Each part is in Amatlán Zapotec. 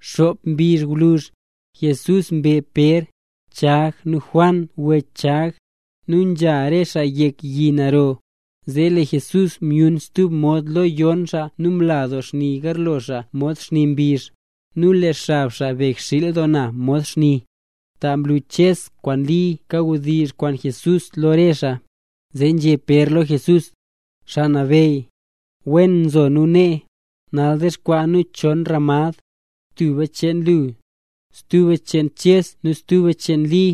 Xop mbizh gwluzh, Jesús mbe Pér, Chag nu Juan wech Chag. Nu nzha re xaa yek yi naro. Zee lee Jesús myun stub mod lo yon xaa nu mla doo xni garlo xaa mod xni mbizh; nu lee xab xaa begxiil doo na mod xni. Ta mlu Ches kwaan Li kawdizh kwaan Jesús lo re xaa. Zee nzhé Pér lo Jesús: —Xaa Nabeyy. ¡Wen nzo nu nee! Nal dexkwaa nu chon ramad: tuba cheen lu, stuba cheen Ches nu stuba cheen Li.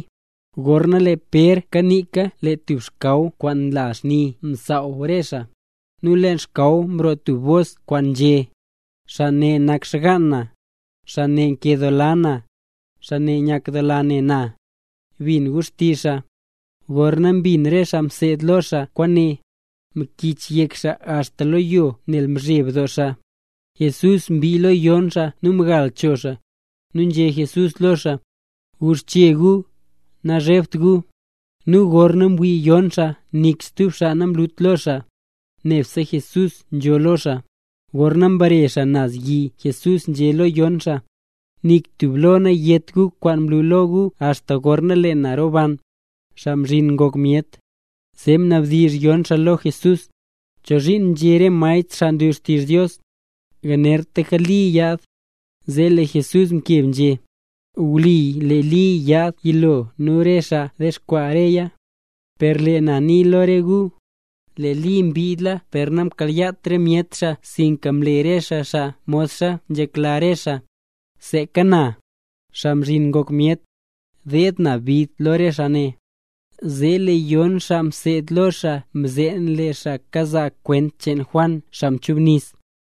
Gorna lee Pér kaniika lee tub xkaw kwaan nla xni msaaw re xaa. Nu leen xkaw mroo tub bos kwaan nzhé: —Xaa ne nak xgaan na, xaa nkedoola na, xaa nyakla na ne na. Bin gu xtizh xaa. Gorna mbin re xaa mseed lo xaa kwaane, mkichyek xaa axta lo yo nel mzheb doo xaa. Jesús mbii lo yon xaa nu mgal cho xaa, nu nzhé Jesús lo xaa: —Guxche gu, nazhebt gu. Nu gorna mwii yon xaa nik stub xaa namlut lo xaa, nebse Jesús nzo lo xaa. Gorna mbare xaa naz yi Jesús nzhé lo yon xaa: —Nik tub lo nayét gu kwaan mlu lo gu axta gorna lee na roban, Xaa Mzhin Ngok Myet. Zee mnabdizh yon xaa lo Jesús: —¿Chozhiin nzhé re maestr xaa nlu xtizh Dios, yanertlaka Li yaad? Zee lee Jesús mkeb nzhé: —Wli, lee Li yaad yilo nu lee xaa dexkwaa reya. Per lee na nii lo gu, lee Li mbiidla per namkayaat re myet xaa sinka mle re xaa xaa modxa nzhekla re xaa. Seeka na, Xaa Mzhin Ngok Myet, deed na bid doo lo re xaa ne. Zee lee yon xaa mseed lo xaa mzeen lee xaa kazaa kwent cheen Juan xaa mchubnis.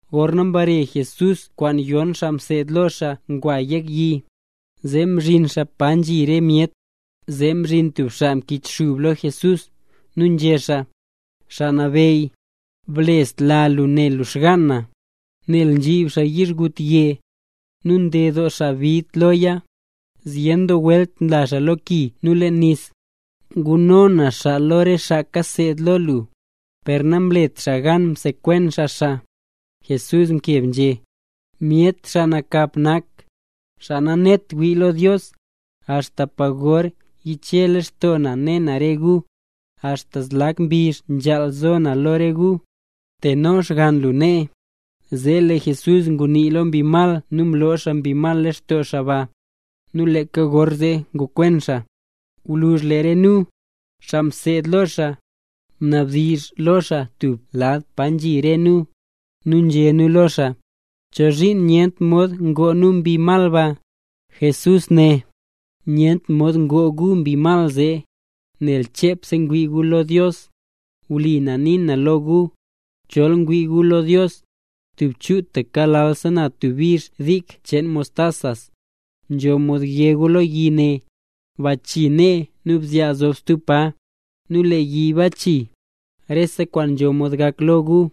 Gorna mbare Jesús kwaan yon xaa mseed lo xaa ngwa yek yi, zee mzhin xaa pa nzhi re myet. Zee mzhin tub xaa mkichxub lo Jesús, nu nzhé xaa: —Xaa Nabeyy, blesla lu ne lu xgaan na, nel nzhib xaa yizhgutye. Nu nded doo xaa bid loya, zyen doo welt nla xaa lo ki nu leen nis. Nguno na xaa lo re xaa kaseed lo lu, per namlet xaa gan msekwen xaa xaa. Jesús mkeb nzhé: —Myet xaa nakap nak, xaa nanet wii lo Dios. ¿Axta pa gor yiche lextoo na ne na re gu? ¿Axta zlak mbizh nzhaal zo na lo re gu? Teno xgann lu nee. Zee lee Jesús ngunii lo mbi mal nu mloo xaa mbi mal lextoo xaa ba. Nu leeka gorzee ngokwen xaa. Gwluzh lee re nu, xaa mseed lo xaa, mnabdizh lo xaa tub lad pa nzhi re nu, nu nzhé nu lo xaa: —¿Chozhiin nyent mod ngoo nu mbi mal ba? Jesús né: —Nyent mod ngoo gu mbi mal zee, nel chepse ngwii gu lo Dios. Wli na nii na lo gu, chol ngwii gu lo Dios, tub chutaka lalsa na tub bizh dik cheen mostas, nzho mod yé gu lo yi ne: “Bachii nee nu zyaa stub pa”, nu lee yi bachii. Rese kwaan nzho mod gak lo gu.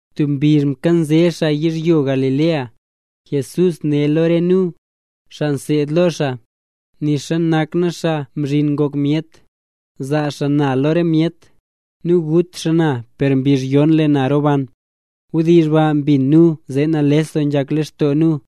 Tub mbizh mkanze xaa yizhyo Galilea, Jesús né lo re nu, xaa mseed lo xaa: —Nixa nak na Xaa Mzhin Ngok Myet, zaa xaa na lo re myet. Nu gut xaa na per mbizh yon lee na roban. Wdizh baa mbin nu, zee nales doo ngok lextoo nu.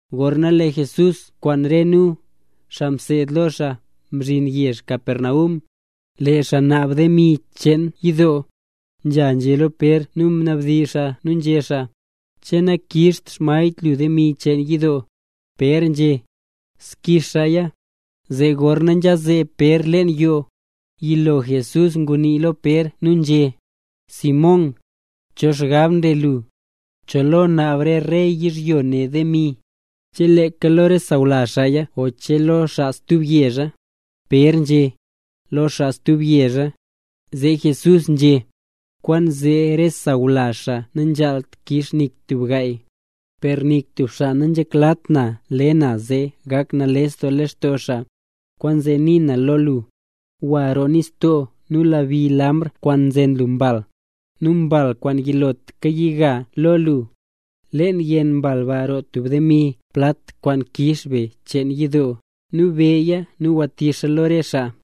Gorna lee Jesús kwaan re nu, xaa mseed lo xaa, mzhin yezh Capernaum, lee xaa naab demi cheen yidoo, nzha nzhé lo Pér nu mnabdizh xaa nu nzhé xaa: —¿Che nakixt xmaestr lu demi cheen yidoo? Pér nzhé: —Zgix xaaya. Zee gorna nzha zeeb Pér leen yoo, yilo Jesús ngunii lo Pér nu nzhé: —¿Simón, cho xgab nle lu? ¿Cho lo naab re rey yizhyo ne demi, che leeka lo re sawlazh xaaya o che lo xaa stub yezha? Pér nzhé: —Lo xaa stub yezha. Zee Jesús nzhé: —Kwaanzee re sawlazh xaa nanzhaalt kix nik tub gaay. Per nik tub xaa nanzheklat na le na zee gak nales doo lextoo xaa, kwaanzee nii na lo lu, gwa roo nistoo nu lebi lambr kwaan nzen lu mbal. Nu mbal kwaan yilotlaka yiga lo lu, leen yenn mbal ba roo tub demi plat kwaan kix be cheen yidoo. Nu beya nu gwatix lo re xaa.